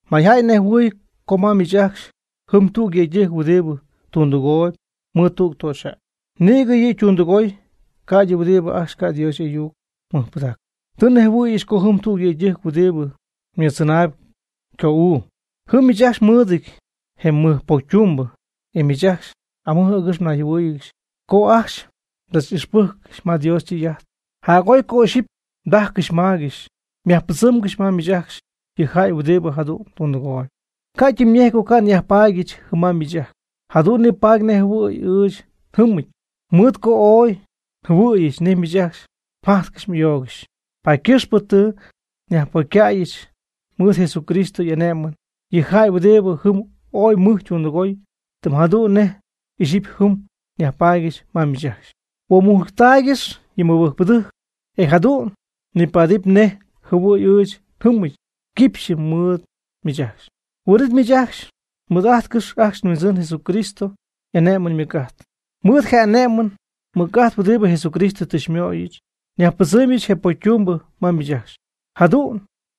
Mayjäy nejhuɨ̈y co ma miich ajcxy jɨm tüg yëydɨjc huɨdibɨ tundɨgooyb mɨɨd tüg töxyjäy. Nïgɨ yɨ' ytundɨgooy ca'ydɨ huɨdi ajcxy ca' Dios y'ayuc mɨjpɨdacɨ. Tɨ nnejhuɨ̈yɨch co jɨm tüg yëydɨjc huɨdibɨ mɨɨddzɨnaayb ycoo'uu. Jɨm miich ajcxy mɨɨdɨty je mɨjpocytumbɨ, e miich ajcxy amɨj agɨxy mnayjɨhuɨ́ɨyɨgɨxy co ajcxy mdzach'ixpɨcyɨty ma Dios ytɨy'ajt. Jac'oy co ixyipy mdajcɨxy mmaygɨxy. Yajpɨdzɨmgɨx ma miich ajcxy yɨ jäy huɨdibɨ jadu'n tundɨgooyb. Ca' ytɨmyñejɨty co ca' nyajpaadyɨch jɨm ma miich ajcxy. Jadu'n nipaady nej jɨhuɨ̈y ɨɨch njɨmɨty, mɨɨd co ooy njɨhuɨ̈yɨch nej miich ajcxy mjajtcɨxy m'ayoogɨxy. Paady ycɨxpɨ tɨ nyajpocycäyɨch mɨɨd Jesucristo y'ane'mɨn yɨ jäy huɨdibɨ jɨm ooy mɨj ytundɨgooy, tɨm jadu'n nej ixyipy jɨm nyajpaadyɨch ma miich ajcxy. Huomujctaaygɨx yɨ mɨbɨjcpɨdɨjc, e jadu'n nipaadɨpy nej jɨhuɨ̈y ɨɨch njɨmɨty quipxyɨ mɨɨd miich ajcxy. Huin'it miich ajcxy mɨɨd'ájtcɨxɨpy ajcxy ajt nHuindzɨn Jesucristo y'ane'mɨn ymɨc'ajt. Mɨɨd je ane'mɨn mɨc'ajt huɨdibɨ Jesucristo tɨ xymöyɨch, myajpɨdzɨmɨpy je pocytumbɨ ma miich ajcxy. Jadu'n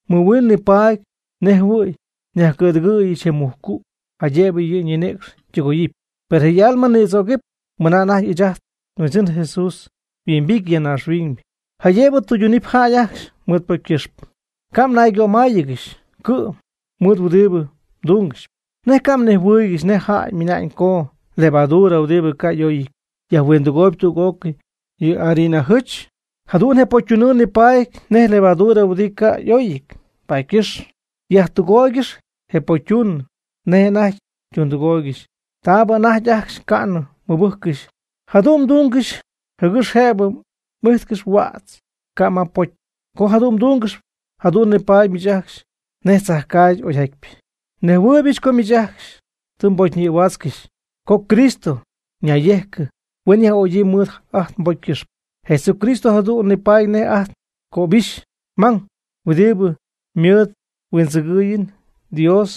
mɨjhuin nipaadɨpy nej jɨhuɨ̈y myajcɨ̈dɨgɨɨygɨxy je mujcu', jaydëbɨ yɨ' ñinïcx ytɨgoyɨpy, per je' y'alma nïdzögɨp mɨna anajty ɨɨch ajt nHuindzɨn Jesús yhuimbity ya naaxhuiñ jaydëbɨ tɨydunɨpy jäy ajcxy mɨɨd ypocy ycɨxpɨ. Ca' mnaygömáayɨgɨxy cɨ'm mɨɨd huɨdibɨ mdungɨxyp. ¿Nej ca' mnejhuɨɨygɨxy nej jäy mɨna'ñ co levadura huɨdibɨ ca' y'oyɨty yajhuindɨgooyb tüg'ócɨy yɨ harina jɨch? Jadu'n je pocytunɨɨ nipaady nej levadura huɨdibɨ ca' y'óyɨty, paady ycɨxpɨ yajtɨgooygɨx je pocytunɨɨ nej anajty mdundɨgóoygɨxy taabɨ anajty ajcxy ca'nɨ mmɨbɨjccɨxy. Jadu'n mdúngɨxɨpy, jɨgɨx jëbɨ m'ijtcɨxyp huädz ca' ma pocy. Co jadu'n mdúngɨxɨpy, jadu'n nipaadɨp miich ajcxy nej tzajcaagy oyjatypɨ. Nejhuɨɨybɨch co miich ajcxy tɨ mbocyñïhuaatzcɨxy, com Cristo nayyejcɨ huen yaj'ögyii mɨɨd ajt nbocy ycɨxpɨ. Jesucristo jadu'n nipaady nej ajt ngöbixy mang huɨdibɨ mɨɨd nhuindzɨgɨɨyɨm Dios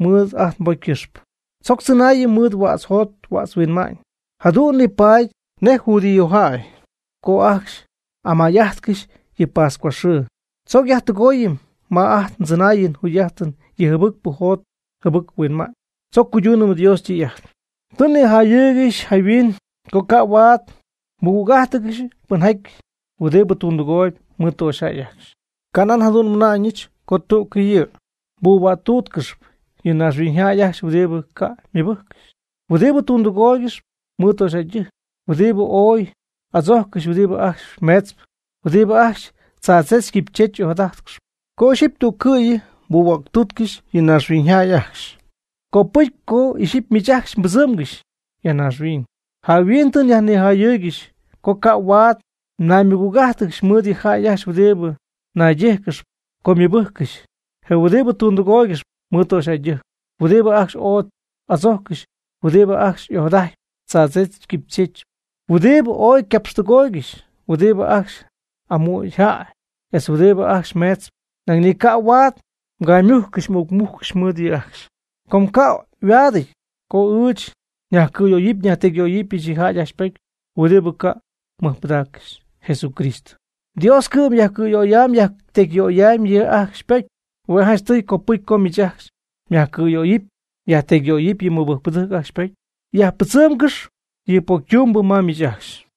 mɨɨd ajt nbocy ycɨxpɨ. Tzoc tzɨnaayɨm mɨɨd huädz njot huädz nhuinma'ñ, jadu'n nipaady nej judíojäy co ajcxy amay'ajtcɨxy yɨ pascua xɨɨ. Tzoc yajtɨgooyɨm ma ajt ndzɨnaayɨn njugy'ajtɨn yɨ jɨbɨc jot jɨbɨc huinma'ñ. Tzoc cuydunɨm Dios ytɨy'ajt. Tɨ nnijayɨɨygɨxy jayhuin co ca' huaad mɨgüg'ájtɨgɨxy pɨnjaty huɨdibɨ tundɨgooyb mɨɨd töxyjäy ajcxy. Ca' nan jadu'n nmɨna'ñɨch co tüccɨ'yɨ mbuhuäctútcɨxɨpy yɨ naaxhuiñjäy ajcxy huɨdibɨ ca' ymɨbɨjccɨxy, huɨdibɨ tundɨgooygɨxp mɨɨd töxyjäydɨjc, huɨdibɨ ooy y'adzojccɨxy, huɨdibɨ ajcxy meetzp, huɨdibɨ ajcxy tzaadzech quipychech ojadajtcɨxp. Co ixyipy tüccɨ'yɨ mbuhuäctútcɨxɨpy yɨ naaxhuiñyjäy ajcxy, copɨcy co ixyipy miich ajcxy mbɨdzɨmgɨx ya naaxhuiñ. Jayhuin tɨ nijayɨɨygɨxy co ca' huaad mnaymɨgüg'ájtɨgɨxy mɨɨd yɨ jäy ajcxy huɨdibɨ naydíjcɨgɨxp co ymɨbɨjccɨxy, je huɨdibɨ tundɨgooygɨxp mɨɨd töxyjäydɨjc, huɨdibɨ ajcxy ooy adzojccɨxy, huɨdibɨ ajcxy ojadajtp tzaadzech quipychech, huɨdibɨ ooy ycapxtɨgooygɨxy, huɨdibɨ ajcxy amügy jäy, etz huɨdibɨ ajcxy meetzp. Nañ ni ca' huaad mgaymujccɨxy m'uucmujccɨxy mɨɨd yɨ' ajcxy. Com ca' yhuaadɨty co ɨɨch nyajcɨ̈yöyɨpy nyajtecyyöyɨpy yɨ jäy ajcxy ypocy huɨdibɨ ca' mɨjpɨdaaccɨxy Jesucristo. Dios cɨ'm yajcɨ̈yöyam yajtecyyöyam yɨ' ajcxy ypocy. Hue' janchtɨy copɨcy co miich ajcxy myajcɨ̈yöyɨp myajtecyyöyɨp yɨ mɨbɨjcpɨdɨjc ajcxy ypocy. Yajpɨdzɨmgɨxp yɨ pocytumbɨ ma miich ajcxy.